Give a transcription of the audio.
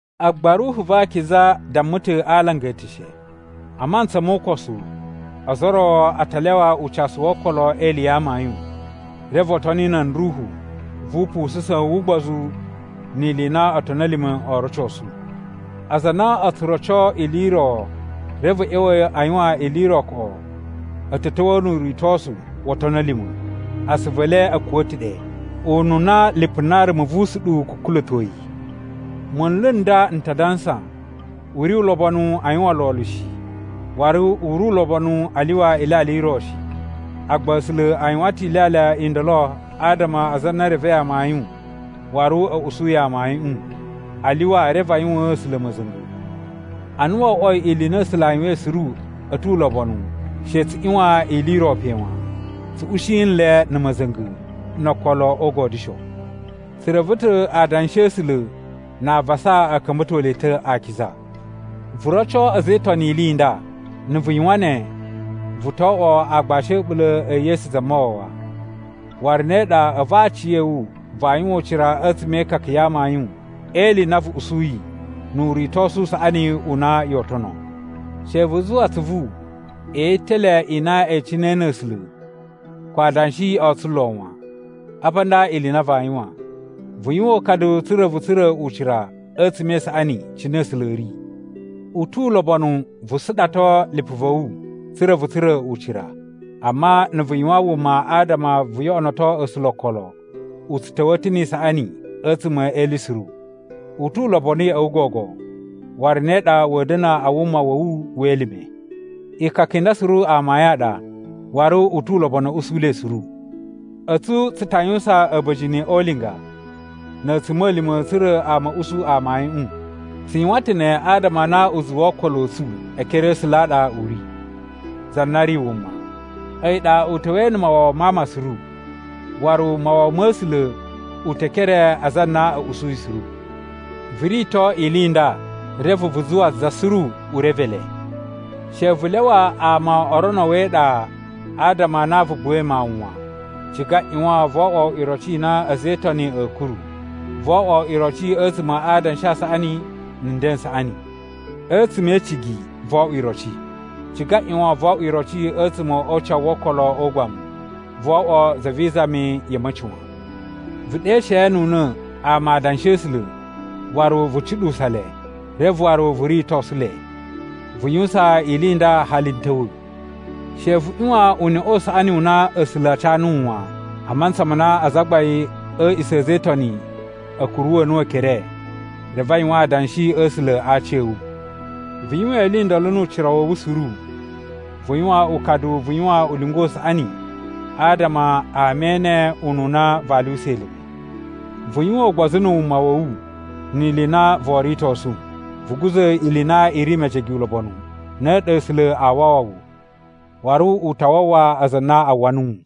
Agba Ruhu va Akiza damma ta̱ a alanga eteshe, a mantsa mo ukosu ozo o ro a ta lyawa ucasu wo okolo e ili ya amayun. Reve o toni nan ruhu vu upusa̱sun wu ugbozu ni ili i na otoni a̱ lima̱ o rocosu. Aza a na o tsu roco ili i ro reve a̱ ꞌya̱wa̱ a yuwan ili i ro koꞌo a̱ ta̱ ta̱wa̱a̱ nu uritosu wo otoni a̱ lima̱. Asuvu e le a̱ kuwa̱ ta̱ ɗe, ununa lipu na rumu vu usuɗuwu kukula̱toi. Munlu n nda n ta dansa, u ri ulobonu a yuwan lolo shi, waru u ri ulobonu a lyuwa ilyalya i ro shi. Agba A̱sula̱ a yuwan ta̱ ilyalya i ndolo adama aza a na e revei amayun waru a̱ usuyi amayuꞌun, a lyuwa reve a yuwaan A̱sula̱ ma̱za̱nga̱. Ana wo oꞌwoi ili i na A̱sula̱ a yuwain suru a̱ tu ulobonu, she tsu ꞌyuwan ili i ro pe wan. Tsu ushi nle na̱ ma̱za̱nga̱ no okolo o ugodyusho. Tsu reve ta̱ adanshi a̱ A̱sula̱ na avasa a̱ ka̱mba̱to le ta̱ akiza. Vu roco a̱za̱ e Itoni ili i nda. Na̱ vu yuwan ne, vu to oꞌwo aagbashi a̱ a̱ɓula̱ e Yesu Zamawawa. Waru ne ɗa a̱vu aciya̱wu vaa yuwan ucira a̱tsuma̱ e ikaka ya amayun e ili i na vu usuyi nu uritosu u saꞌani u na yoo tono. She vu zuwa atsuvu e yitele i na e icinai na̱ A̱sula̱, ko adanshi o tsulo wan. Apa nda ili i na vaa yuwan: Vu yuwan ukadu tsa̱ra̱ vu tsura̱ ucira a̱tsuma̱ e isaꞌani cine A̱sula̱ a̱ ri. U tu ulobonu vu suɗato lipu va̱ wu tsa̱ra̱ vu tsura̱ ucira, amma na̱ vu yuwan wuma adama vu yoꞌonoto A̱sula̱ okolo, u tsu ta̱wa̱a̱ ta̱ ni isaꞌani a̱tsuma̱ e ili suru. U tu ulobonu ya̱ꞌa̱ wu gogo, waru ne ɗa wa̱a̱ da̱na̱ a wuma wa̱ wu we elime. Ikaka i nda suru amayun a ɗa, waru u tu ulobonu a̱ usu le suru. A̱tsu tsu ta yuwusan a̱ba̱jini o ulinga na̱ a̱tsuma̱lima̱ tsa̱ra̱ ama a̱ usu amayuꞌun. Tsu yuwan ta̱ ne adama a na uzuwu wo okolo a̱ tsu e ekere a̱ A̱sula̱ a ɗa u ri, za na ri wuma, a̱yi ɗa u ta̱wa̱i na̱ mawawa ma ama suru, waru mawawa ma̱ A̱sula̱ u te e ekere a aza a na a̱ usuyi suru. Vu rito ili i nda, reve vu zuwa za suru u reve le. She vu lyawa ama o rono wu e iɗa adama a na vu buwai mawun wan. Ciga ꞌyuwan vo oꞌwo iroci i na a̱za̱ e Itoni a̱a̱ kuru. Voo oꞌwo iroci a̱tsuma̱ a adanshi a saꞌani na̱ nden n saꞌani. A̱tsuma̱ e icigi voo oꞌwo iroci. Ciga ꞌyuwan voo oꞌwo iroci a̱tsuma̱ o ucawu wo okolo o ugbamu. Voo oꞌwo za vi izami ya̱ a̱ma̱ci wan. Vu ɗeshe nu una̱ ama Adanshi a̱ A̱sula̱ waru vu cuɗuwusa le, reve waru vu ritosu le. Vu yuwusan ili i nda hali n ta̱wa̱. She vu ꞌyuwan uneꞌe u saꞌani u na A̱sula̱ a ca nuwu wan, a mantsa ma na azagbain a̱ a̱a̱ꞌisa̱ a̱ a̱za̱ e Itoni a̱ kuruwa̱ nuwu ekere, reve a yuwan adanshi a̱ A̱sula̱ a aci a̱ wu. Vu yuwan ili i ndolo nu ucira wa̱ wu suru. Vu yuwan ukadu vu yuwan ulinga u saꞌani adama ama ene ununa vaa lyuwusa elime. Vu yuwan ugbozu na̱ wuma wa̱ wu ni ili i na voo ritosu. Vu guza̱ ili i na i ri mejege ulobonu, ne ɗa A̱sula̱ aa wawa wu, waru u ta wawa aza a na a uwwa nuwu.